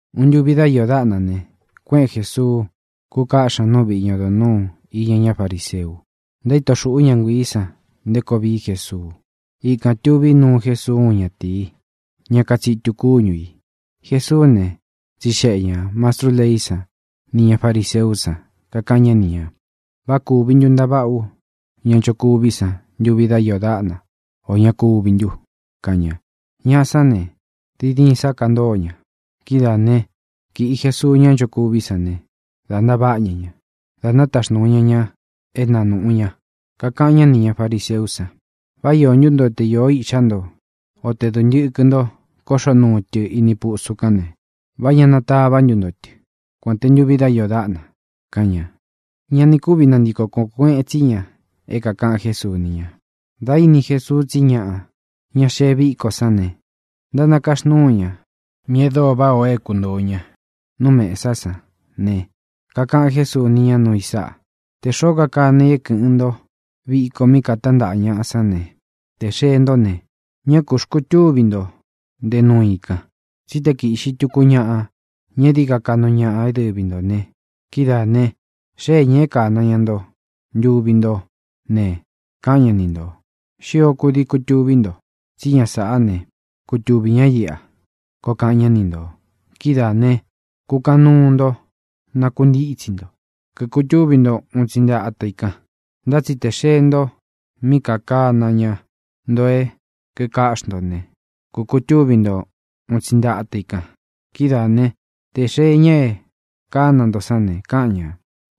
Uun ntuvi dá iō dáꞌna ne, kuéꞌen Jēsuu, kúkaꞌxí ña nú viꞌi ña odo nūu iña ñá fariseu. Ntaíto xūꞌú ña nguiī san nté koo vií Jesuu. Ikān tuví nuu Jésuu úun ñatīi, ñá katsitu kuīñu. Jesuú ne, tsixeꞌe ñā mastrú leí san nī ña fariseú san, kakaꞌan ñá ni ñā: —¿Vá kūvi ntu ntaváꞌa ú ña nchokuví san ntuvi dá iō dáꞌna, ō ña kúvi ntu? —kaꞌan ña. Ñaꞌa sán ne, diin diin sá kantóo ña. Kidáa ne, kīꞌi Jesuu ñá nchokuví san ne, dā ntaváꞌa ña ña, dā nátaxnūu ña ña é na nūꞌu ña. Kakaꞌan ñá nī ña fariseú san: —¿Vá iō ntú nto te īꞌxá nto o te dūntɨkɨ nto kóꞌxo nuu tɨ ini pusu kán ne, vá ña natavá ntu nto tɨ, kuān te ntuvi dá iō dáꞌna? —kaꞌan ña. Ña ni kúvi nantiko kōo kueꞌen tsí ña é kākaꞌan Jésuu ni ña. Dā íni Jesuu tsí ñaꞌa, ña xeé viꞌi viko sán ne, ntánakaxnúu ña míꞌī e dóo váꞌā o é kuntōo ña nú mesá san ne, kakaꞌan Jésuu ni ña núu i sáꞌa: —Tē xoó kakana i é kɨ̄ꞌɨn ntó viko mí kātántaꞌa ñaꞌa sán ne, tē xee ntó ne, ñá kū xkutúvi ntō nte nuu i kan, tsí te kīꞌxi tuku ñaꞌa, ña é dií ka kaꞌnu ñaꞌa é dɨvi ntō ne, kidáā ne, xéē ña é kāna ña nto ntuvi ntó ne, káꞌan ña ni ntō: “Xio kudii kutuví nto, tsí ña sāꞌá ne, kutuvī ñá iꞌa”, koo kaꞌan ñá ni ntō. Kidáā ne, kukaꞌan nuu nto nakuntítsi nto, kikutúvi nto un tsi nte ata i kan. Ntá tsi tē xee nto mí kākana ña nto é kīkaꞌxi nto ne, kūkutúvi nto un tsi nte ata i kan. Kidáā ne, tē xee ña e kána nto sán ne, káꞌan ñā: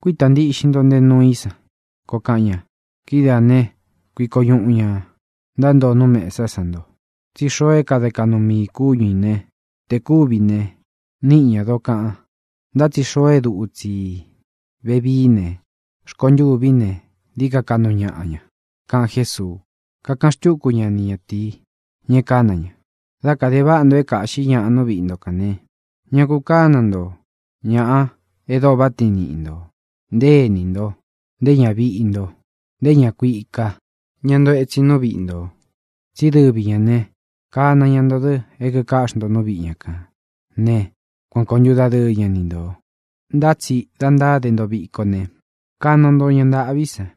“Kuítā ntiꞌxin nto nte nuu i san”, koo kaꞌan ña. Kidáā ne, kuiko ñuꞌu ñā ntántoo nú mesá san nto. Tsí xoo é kade kaꞌnu mii ī kúñu ī ne, tē kúvi ne, níꞌi ñā dokaꞌan; ntá tsi xoo é dutsi i vevií ne, rkontûví ne, dií ka kukaꞌnu ñaꞌa ña —kaꞌan Jésuu. Kakaꞌan xtúku ña ni ñatīí, ña e kána ña: —Dá kāde váꞌa nto é kāꞌxí ñaꞌa nú viꞌi nto kān ne, ña ku kána nto ña e dóo váꞌa tiin niꞌi ntō, nté ēní nto, nté ñaviꞌi nto, nté ñā kuika, ña ntoo etsin nú viꞌi ntō. Tsí dɨvi ñā né, kāna ña nto dɨ é kikáꞌxi nto nú viꞌi ña kān né, kuan kōo ntúdadɨɨ ña ni ntō. Ntá tsi da ntáde nto viko ne, kana nto ña ntāꞌví san,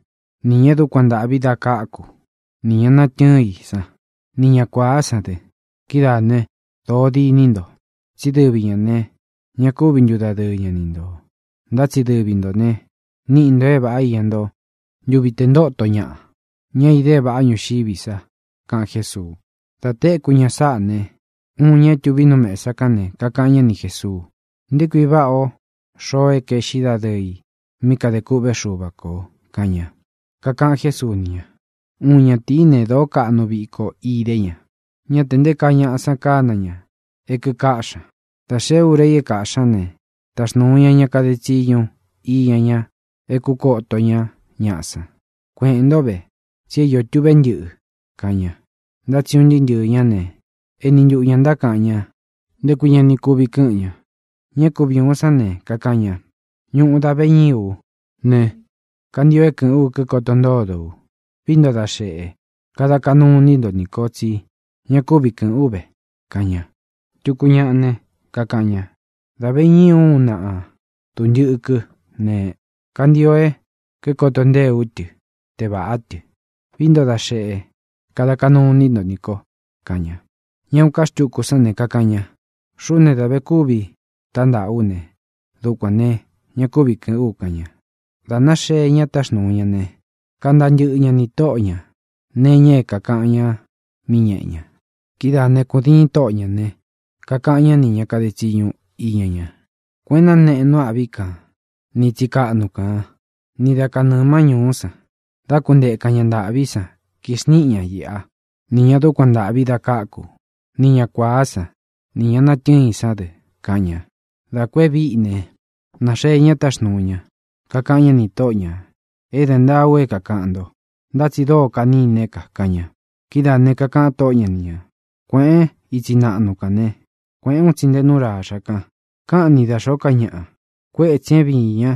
nī ña e dúkuan ntāꞌví da káku, nī ña natɨ́ɨn i san, ni ña kuāá san dɨ. Kidáā ne, dōo diní nto. Tsí dɨvi ñā ne, ña kúvi ntudadɨɨ ña ni ntō. Ntá tsi dɨvi ntō ne, níꞌi nto é vāꞌá iña nto ntuvi te ntóto ñaꞌa, ña é īde é vāꞌá ñuxiví sa —kaꞌan Jésuu. Dā téku ña sáꞌā ne, uun ña é tuví nu mesa kán ne, kakaꞌan ñá ni Jēsuu: —¡Nté kui váꞌa o xoo e kaeꞌxí dadɨɨ i mí kadē kûꞌvé Xuva kō! —kaꞌan ña. Kakaꞌan Jésuu ni ña: —Uun ñatīí ne, dōó kaꞌnu viko idé ña. Ñá tē nté kaa ñaꞌa san kána ña é kīkáꞌxi ña. Dā xeé ura i é kāꞌxí ña ne, taxnūu ña ña kade tsiñu iña ña é kūkoto ñá ñaꞌa san: “Kueꞌēn ntó ve, tsi é iō tuꞌvé ntɨꞌɨ”, kaꞌan ña. Ntá tsi un ntɨɨ́ ntɨɨ̄ ñá ne, éni ntuꞌu ñā ntákaꞌan ña nté kui ña ni kuvi kɨ́ꞌɨn ña. Ña é kuvi ūun sán ne, kakaꞌan ña: “Ñuꞌu da ve ñíī ú ne, kantio é kɨ̄ꞌɨ́n u kikoto ntódo u. Vií nto da xēꞌe, kada kaꞌnú ini nto nī ko tsí ña kúvi kɨ́ꞌɨn ú ve”, kaꞌan ña. Tuku ñaꞌa ne, kakaꞌan ña: “Dā ve ñíī ú uꞌun náꞌa dūntɨkɨ ne, kantio é kikoto ntée ú tɨ tē vaꞌá tɨ. Vií nto da xēꞌe, kada kaꞌnú ini nto nī ko”, kaꞌan ña. Ña uun ká xtuku sán ne, kakaꞌan ña: “Xuꞌú ne, dā ve kúvi tántaꞌa ú ne, dukuān ne, ña kúvi kɨ̄ꞌɨ́n u”, kaꞌan ña. Dā náxee ña táxnūu ñá ne, kantaa ntɨꞌɨ ña nī tóꞌo ñā nee iña é kākaꞌan ñá mí ñeꞌe ña. Kidáā né, kūdiin tóꞌo ñā ne, kakaꞌan ñá nī ña kade tsiñu iña ña: “Kuēꞌen náneꞌen nú āꞌví kan ni itsi kaꞌnu kān, ni da kanɨɨ̄ má ñūú san, dá kuntēkan ña ntaꞌví san, kixniꞌin ña iꞌa, ni ñā dúkuan ntāꞌví da káku, ni ña kuāá san, ni ñā natɨ́ɨn sán dɨ”, kaꞌan ña. Dā ku e víꞌi ne, nāxee ña táxnuu ña, kakaꞌan ñá nī tóꞌo ñā: “É de ntáa u é kākaꞌan nto, ntá tsi dóo kaniné ka”, kaꞌan ña. Kidáā ne, kakaꞌan tóꞌo ña ni ñā: “Kuēꞌen ítsi naꞌnu kan ne, kuēꞌén un tsi nte nu ráxa kān, káꞌan ni da xōó ka ñaꞌa, kuétsī é viīn ñá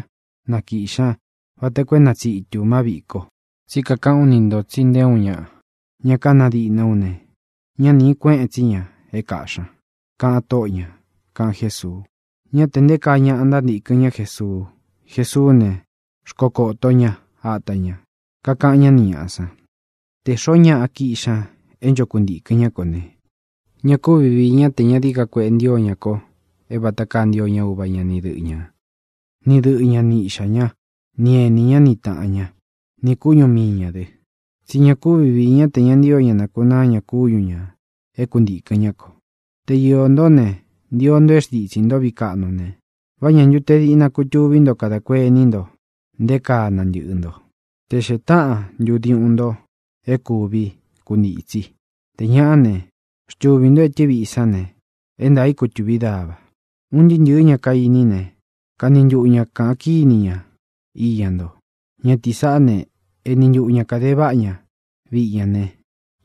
na kīꞌxi ñá vata koo é na tsītu ña ma víꞌi ko. Tsí kakaꞌán u ni ntō tsi nté uun ñaꞌa, ña kana díꞌna ú ne, ñá nīꞌi kuéꞌen tsi ña é kāꞌxí ña”, kaꞌan tóꞌo ñā —kaꞌan Jésuu. Ñá tē nté kaa ñaꞌa ntántīkɨn ñá Jesuu. Jesuú ne, xkokōo ñá ata ña, kakaꞌan ñá ni ñāꞌa san: —Tē xoó ñaꞌa kiꞌxi ña é ncho kuntīkɨn ñá ko ne, ña kúvi viī ñá tē ñá dií ka kueꞌe ntío ña ko é vata kaa ntío ña uva ña ni dɨꞌɨ ñā, ni ñadɨꞌɨ̄ ñá ni īꞌxá ña, ni enī ñá ni tāꞌan ñá, nī kúñu mii ñā dɨ. Tsí ña kúvi viī ñá tē ña ntío ña nākunáa ña kúñu ñā é kuntīkɨn ñá ko. Te iō ntó ne, ntio nto é xntitsī ntó viꞌi kaꞌnu ne, ¿vá ña ntu te diꞌna kutuví nto kadā kuení nto nté kaa nantɨꞌɨ nto, te xēe táꞌan ntu diuꞌun nto é kuvi kuntītsi? Tē ñá ne, xtuvī ntó etɨ́ viꞌi sán ne, é ntaā i kutuvi dava. Un ntɨɨ́ ntɨ̄ɨ́ ña kainí ne, kani ntuꞌu ñā kaꞌan kíni ña iña nto: “Ñatīí saꞌá ne, eni ntuꞌu ña kāde váꞌa ña viꞌi ña ne,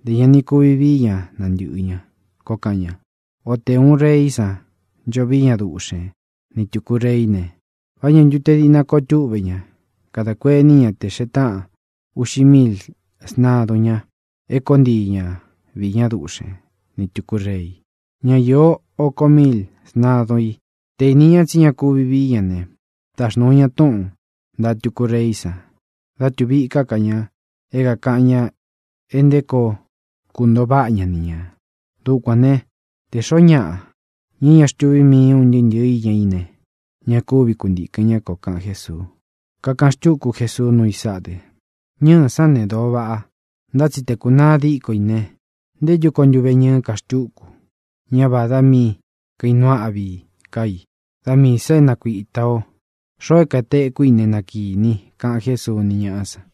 ntē ña ni kuvi vií ña nantɨ̄ꞌɨ ñá”, koo kaꞌan ña. Ō te uun reí san ncho víi ña duꞌxen ni tūku reí ne, ¿vá ña ntu te diꞌna kutuví ña kadā kuení ña te xēe táꞌan uꞌxi míil sntadun ña é kōó ntii ña viī ñá duꞌxen ni tūku rei, ñá īó ōko míil sntadun i? Tē íni ña tsí ña kuvi vií ña ne, taxnūu ña túꞌūn ntaꞌa tuku reí san dá tuvi íka ká ña é kākan ña e nté koo kuntōo váꞌa ña ni ñā. Dukuān né, te xōó ñaꞌa, ña é ña xtuví mii i ūn ntɨ́ꞌɨ īña í ne, ña kúvi kuntīkɨn ñá ko —kaꞌan Jésuu. Kakaꞌan xtúku Jesuu nuu i sáꞌa dɨ: —Ñɨ́ɨ̄ sán ne, dōo vaꞌa. Ntá tsi tē kúnaa díko i ne, ¿nté ntu koo ntuveñɨɨ́ ka xtúku? Ñá vādá mi kainuu áꞌvi ká i; da miī sa é nakuīta o. Xoo é kātekú i ne, na kīni i —kaꞌan Jésuu ni ñáꞌa san.